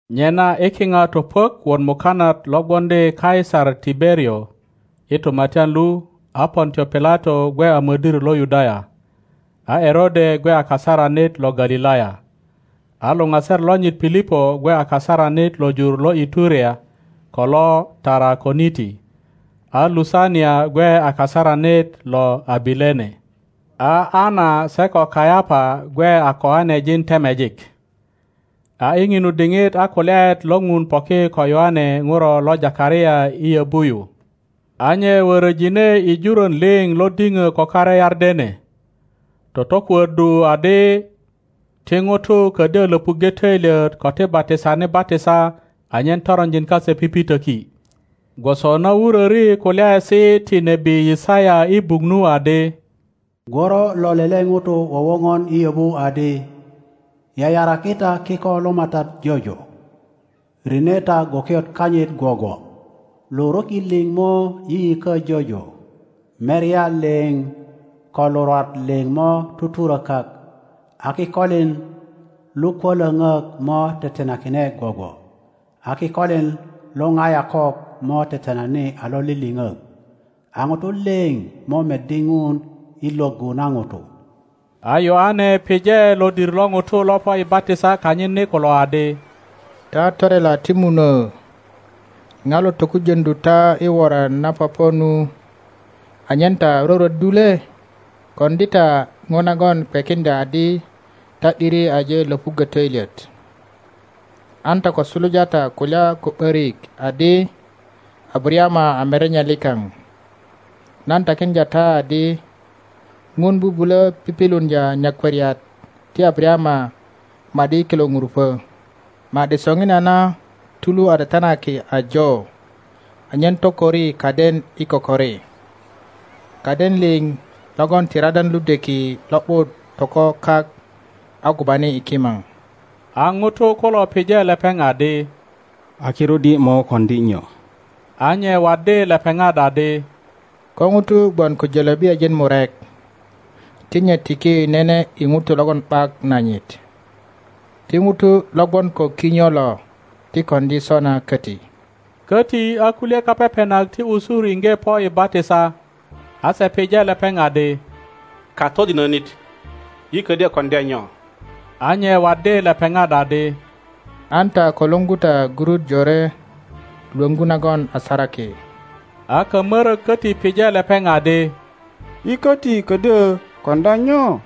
Nyena i kiŋa topuök wot mukanat lo gwoŋdi Kaisar Tiberio i tumatyan lu, a Pontio Pilato gwe a modir lo Yudaya, a Erode gwe a kasaranit lo Galilaya, a luŋaser lonyit Pilipo gwe a kasaranit lo jur lo iturea ko lo Tarakoniti, a Lusania gwe a kasaranit lo Abilene, a Ana se ko Kayapa gwe a koanejin temejik. A i ŋinu diŋit a kulyaet lo Ŋun poki ko Yoane ŋuro lo Takaria i yöbu yu. A nye worojine i juron liŋ lo diŋö ko kare Yardene, totokuöddu adi ti ŋutu ködyö löpuŋge töilyet ko ti batisani batisa anyen toronjin kase pipitöki, gwoso na wuröri kulyaesi ti nebi Yisaya i buk nu adi, Gworo lo lele ŋuto wowoŋon i yöbu adi, Yayaraki ta kiko lo MATAT jojo, rine ta gwokiot kanyit gwogwo. Luruki liŋ mo yiyikö jojo, merya liŋ ko lurwat liŋ mo tuturökak; a kikolin lukwölöŋök motetenakine gwogwo, a kikolin lorayokok mo tetenani a loliliŋok; a ŋutu liŋ mo meddi Ŋun i lwöggu na ŋutu. A Yoane pije lodir lo ŋutu lo po i batisa kanyit ni kulo adi, Ta torela ti munuö, ŋa lo tokujöŋdu ta i woran na popo nu anyen ta rwörwöddu le? Koŋdi ta ŋo nagon kwekiŋdya adi ta ’diri aje lopuggö töilyet. An ta ko suluja ta kulya ko ’börik adi, Abarayama a merenye likaŋ. Nan takiŋdya ta adi Ŋun bubulö pipiluŋdya nyakwariat ti Abarayama ma ’di i kilo ŋurupö. Ma ’di soŋinana tulu a tetenaki ajo anyen tokori kaden i kokori. Kaden liŋ logon ti radan ludweki lo ’but toko kak a gubani i kimaŋ. A ŋutu kulo pije lepeŋ adi, A kirut yi mo koŋdi nyo? A nye waddi lepeŋat adi, Ko ŋuto gwon ko jölöbiyajin murek, ti nye tiki nene i ŋuto logon ’bak nanyit; ti ŋuto lo gwon ko kinyo lo ti koŋdi sona köti. Köti a kulye kapepenak ti usur iŋge po i batisa, a se pije lepeŋ adi, Katodinönit, yi ködyö koŋdya nyo? A nye waddi lepeŋat adi, An ta ko luŋgu ta gurut jore lwöŋgu nagon a saraki. A kamörök köti pije lepeŋ adi, Yi köti ködyö koŋdya nyo?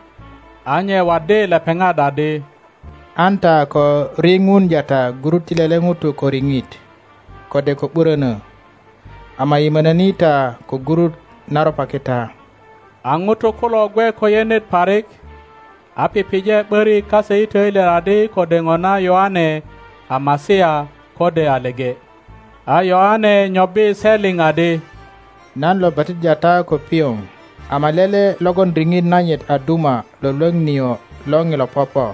A nye waddi lepeŋat adi, An ta ko riŋuŋdya ta gurut ti lele ŋuto ko riŋit kode ko ’burönö; ama yimönöni ta ko gurut na ropaki ta. A ŋutu kulo gwe ko yenet parik, a pije ’börik kase i töilyet adi kode ŋona Yoane a Masia, kode a leŋe. A Yoane nyobbi se liŋ adi, Nan lo batiddya ta ko pioŋ, ama lele logon riŋit nanyit a duma lwölwöŋ nio lo ŋilo popo;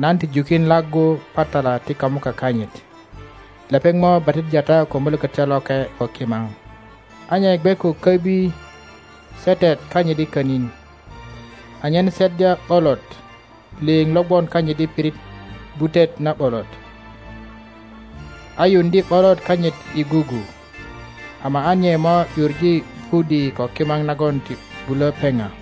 nan ti jukin laggu patala ti kamuka kanyit. Lepeŋ mo batiddya ta ko Mulökötyo Loke ko kimaŋ. A nye gwe ko köbi setet kanyit i könin, anyen seddya ’bolot liŋ lo gwon kanyit i pirit gwutet na ’bolot, a yuŋdye ’bolot kanyit i gugu; ama a nye mo ’yuŋe pudi ko kimaŋ nagon ti bulo peŋa.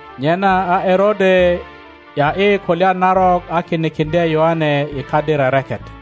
Nyena a Erode ’ya ’yi kulya narok a kinikiŋdye Yoane i kadi rereket.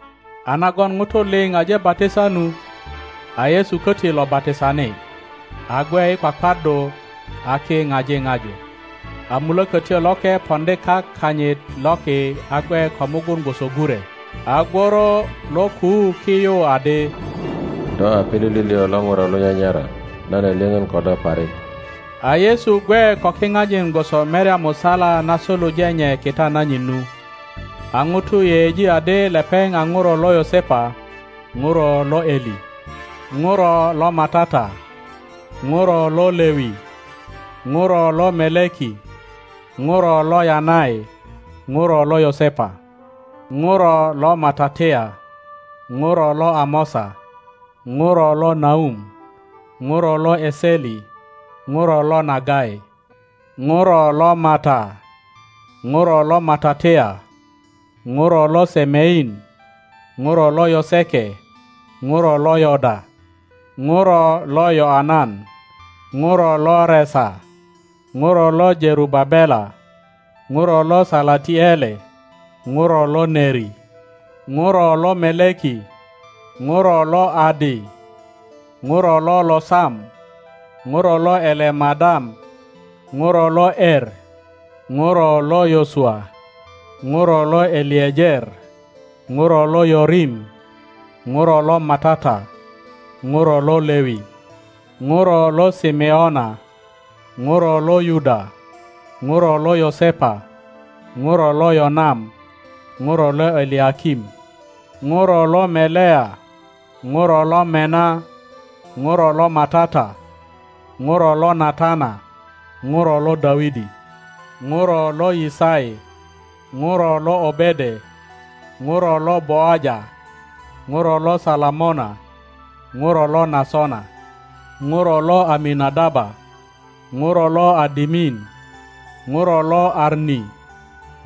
A nagon ŋutu liŋ aje batisa nu, a Yesu köti lo batisani, a gwe i kwakwaddu, a ki ŋaji ŋaju, a Mulökötyo Loke poŋdi kak kanyit loki a gwe ko mugun gwoso gure. A gworo lo kuu ki yu adi, Do a pilili liŋ lo ŋuro lo nyanyara, nan a lyöŋön ko do parik. A Yesu gwe ko kiŋajin gwoso merya musala na suluje nye kita nanyit nu. A ŋutu yeyeji adi lepeŋ a ŋuro lo Yosepa, ŋuro lo Eli, ŋuro lo MATAT a, ŋuro lo Lewi, ŋuro lo Meleki, ŋuro lo Yanai, ŋuro lo Yosepa, ŋuro lo Matatia, ŋuro lo Amosa, ŋuro lo Naum, ŋuro lo Eseli, ŋuro lo Nagai, ŋuro lo Mata, ŋuro lo Matatia, ŋuro lo Semein, ŋuro lo Yoseke, ŋuro lo Yoda, ŋuro lo Yöanan, ŋuro lo Resa, ŋuro lo Jerubabela, ŋuro lo Salatiele, ŋuro lo Neri, ŋuro lo Meleki, ŋuro lo Adi, ŋuro lo Losam, ŋuro lo Elemadam, ŋuro lo Emuro lo Yosua, ŋuro lo Eliejer, ŋuro lo Yorim, ŋuro lo MATAT a ŋuro lo Lewi, ŋuro lo Simeona, ŋuro lo Yuda, ŋuro lo Yosepa, ŋuro lo Yonam, ŋuro lo Eliakim, ŋuro lo Melea, ŋuro lo Mena, ŋuro lo MATAT a, ŋuro lo Natana, ŋuro lo Dawidi, ŋuro lo Yisai, ŋuro lo Obede, ŋuro lo Boaja, ŋuro lo Salamona, ŋuro lo Nasona, ŋuro lo Amina-daba, ŋuro lo Adimin, ŋuro lo Ami,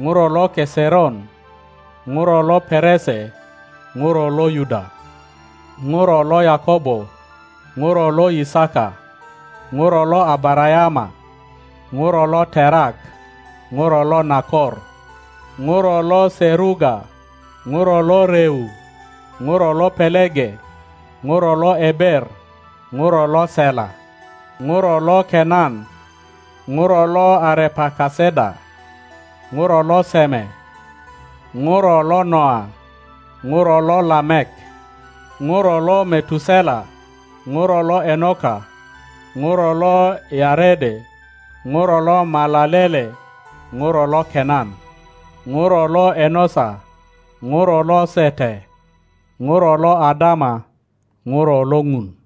ŋuro lo Keseron, ŋuro lo Perese, ŋuro lo Yuda, ŋuro lo Yakobo, ŋuro lo Yisaka, ŋuro lo Abarayama, ŋuro lo Terak, ŋuro lo Nakor, ŋuro lo Seruga, ŋuro lo Reu, ŋuro lo Pelege, ŋuro lo Eber, ŋuro lo Sela, ŋuro lo Kenan, ŋuro lo Arepakesada, ŋuro lo Seme, ŋuro lo Noa, ŋuro lo Lamek, ŋuro lo Metusela, ŋuro lo Enoka, ŋuro lo Yarede, ŋuro lo Malalele, ŋuro lo Kenan, ŋuro lo Enosa, ŋuro lo Sete, ŋuro lo Adama, ŋuro lo Ŋun.